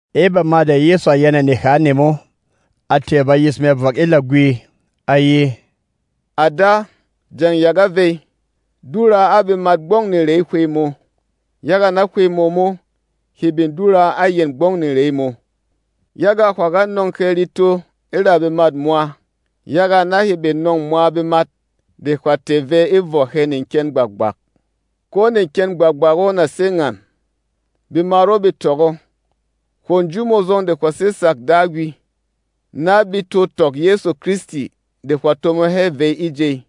E bama de Yɛsu a yɛnɛ neha nemo, a tɛ̀ bayis mɛ vɔk e lagwi, a ye, “À Da, jeng ya ga vey. Dura a bemat gbɔng nerêy Hwey mō, yaga na Hwey mō mo he bin dura a yɛn gbɔng nerey mō. Yaga hwà ga nɔ̂ng hɛ reto e ra bemât mwa, yaga na he bin nɔ̂ng mwa bemat de hwà tɛ̀ vɛ e vɔ hɛ neken gbak-gbak. Ko neken gbak-gbak o na sé ngan: Bemat o bē tɔk o, hwo nju mō zɔng de hwà sé tsak Dagwi, na be to tɔk Yɛsu Kristi de hwà tomo hɛ vey e jey.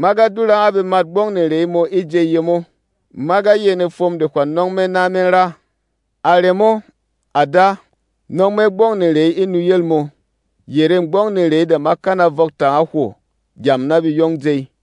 Ma ga dura a bemat gbɔng nerey mō e jey yemo; ma ga yɛnɛ fwom de hwà nɔng me na me ra. A remo, à Da, nɔng me gbɔng nerey e nuyel mō, yerê gbɔng nerey de ma kana vɔk tanga hwo gyam na be yong jey.”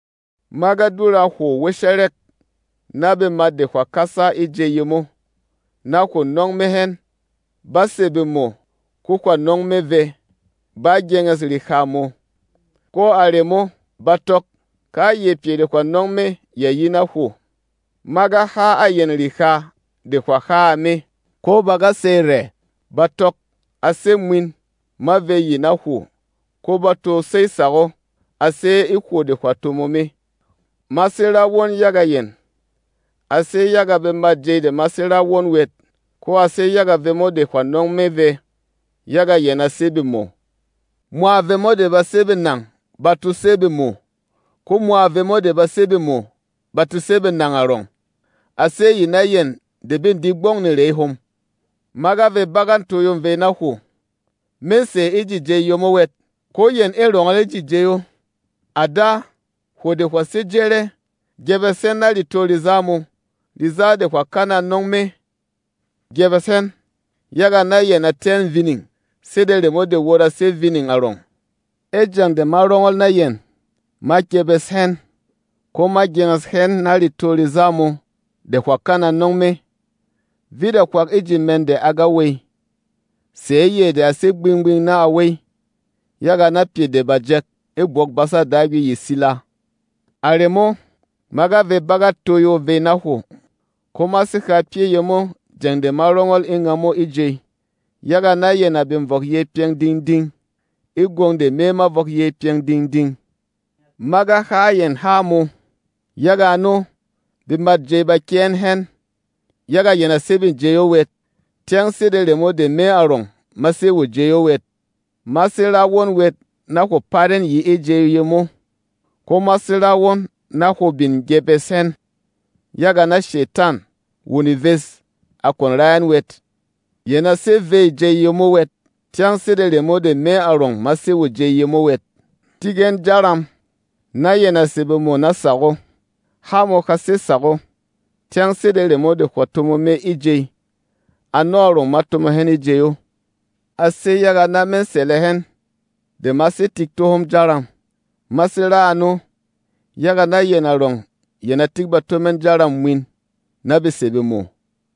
“Ma ga dura hwo wɛshɛrɛk na bemat de hwà kasa e jey yemo na hwo nɔng me hɛn. Bá sè bemo, ko hwà nɔng me vɛ. Bá gyenges reha mō, ko a remo, ba tɔk, kayɛ pyɛ de hwà nɔng me ya yi na hwo. Ma ga ha a yɛn reha de hwà ha a me, ko ba ga sey rɛ. Ba tɔk, a sé mwin, ma vey yi na hwo, ko ba to sey tsak o, a sé e hwo de hwà tomo me. “Ma sé ra won yaga yɛn. A sé yaga bemât jey de ma sé ra won wɛt, ko a sé yaga vemo de hwà nɔng me vɛ, yaga yɛn a sé bemo. Mwa vemo de ba sé benang ba to sé bemo, ko mwa vemo de ba sé bemo ba to sé benang arɔng. A sé yi na yɛn de be di gbɔng nerey hom. Ma ga vey bagât toyo vey na hwo. Mê sè e ji jey yemo wɛt, ko yɛn ê rɔngɔl e ji jey o. À Da, hwo de hwà sé jɛrɛ, gyepes hɛn na retô reza mō, reza de hwà kana nɔng me. Gyebes hɛn, yaga na yɛn a tɛ́ ɛn vining, sede remo de wot a sé vining arɔng. E jeng de ma rɔngɔl na yɛn, ma gyepes hɛn, ko ma gyenges hɛn na retô reza mō de hwà kana nɔng me. Vit a hwak e ji mɛn de a ga wey, sɛ̌ yɛ de a sé gbing-gbing na a wey, yaga na pyɛ de bà jɛk e Bwok-basa Dagwi ye sila. A remo, ma ga vey bagât toyo vey na hwo. Ko ma sé ha pyɛ́ yemo jeng de ma rɔngɔl e ngamo e jey, yaga na yɛn a bin vɔk yey pyɛng ding-ding e gwong de me ma vɔk yey pyɛng ding-ding. Ma ga ha a yɛn há mō. Yaga ano, bemât jey ba kyɛ́ ɛn hɛn, yaga yɛn a sé vê jey o wɛt, tyɛng sede remo de me arɔng ma sé wo jey o wɛt. Ma sé ra won wɛt na hwo pat ɛn yi e jey yemo; ko ma sé ra won na hwo bin gyepes hɛn, yaga na Shetan, wo neves, a kwon ra ɛn wɛt. Yɛn a sé vê jey yemo wɛt, tyɛng sede remo de me arɔng ma sé wo jey yemo wɛt. Tik ɛn jaram, na yɛn a sè bemo na tsak o. Há mō ha sé tsak o. Tyɛng sede remo de hwà tomo me e jey, ano arɔng ma tomo hɛn e jey o. A sé yaga na me sɛlɛ hɛn de ma sé tik tó hom jaram. Ma sé ra ano, yaga na yɛn arɔng yɛn a tik bato mɛn jaram mwin, na be sè bemo.”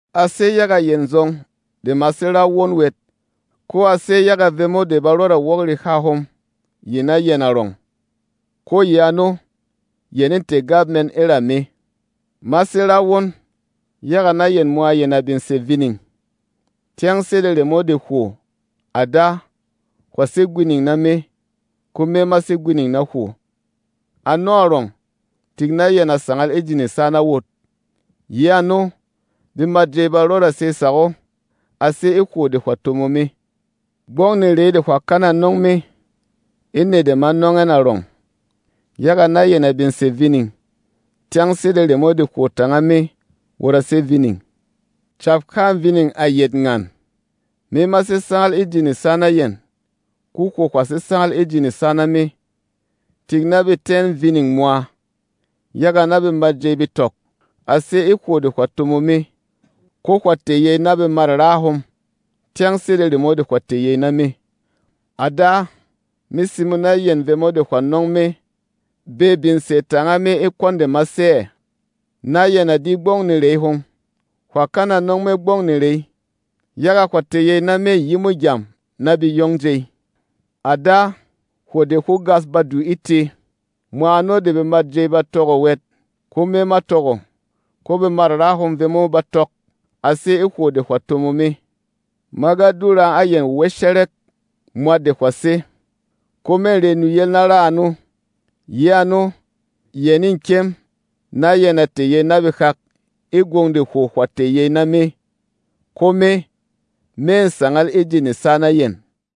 “A sé yaga yɛn zɔng de ma sé ra won wɛt, ko a sé yaga vemo de ba rɔda wok reha hom yi na yɛn arɔng, ko yi ano, yɛn ê tɛ̀ gap mɛn e ra me. Ma sé ra won, yaga na yɛn mwa yɛn a bin sè vining. Tyɛng sede remo de hwo, à Da, hwà sé gwining na me, ko me ma sé gwining na hwo, ano arɔng, tik na yɛn a sangal e ji nesa na wot. Yi ano, bemât jey ba rɔda sey tsak o, a sé e hwo de hwà tomo me. Gbɔng nerey de hwà kana nɔng me, e nɛ de ma nɔng ɛn arɔng, yaga na yɛn a bin sè vining, tyɛng sede remo de hwo tanga me wot a sé vining. Cap-hâ vining a yet ngan: Me ma sé sangal e ji nesa na yɛn, ko hwo hwà sé sangal e ji nesa na me. Tik na be tɛ́ ɛn vining mwa, yaga na bemât jey be tɔk, a sé e hwo de hwà tomo me, ko hwà tɛ̀ yey na bemât raa hom, tyɛng sede remo de hwà tɛ̀ yey na me. “À Da, me simo na yɛn vemo de hwà nɔng me be bin sè tanga me e kwɔn de ma sé ɛ̀, na yɛn a di gbɔng nerey hom. Hwà kana nɔng me gbɔng nerey, yaga hwà tɛ̀ yey na me yimo gyam na be yong jey. À Da, hwo de hwó gas badu e tē, mwa ano de bemât jey ba tɔk o wɛt, ko me ma tɔk o. Ko bemât raa hom vemo ba tɔk, a sé e hwo de hwà tomo me. Ma ga dura a yɛn wɛshɛrɛk mwat de hwà sé, ko mê re nuyel na ra ano. Yi ano, yɛn ê kyɛm na yɛn a tɛ̀ yey na behak e gwong de hwo hwà tɛ̀ yey na me, ko me, mê sangal e ji nesa na yɛn.”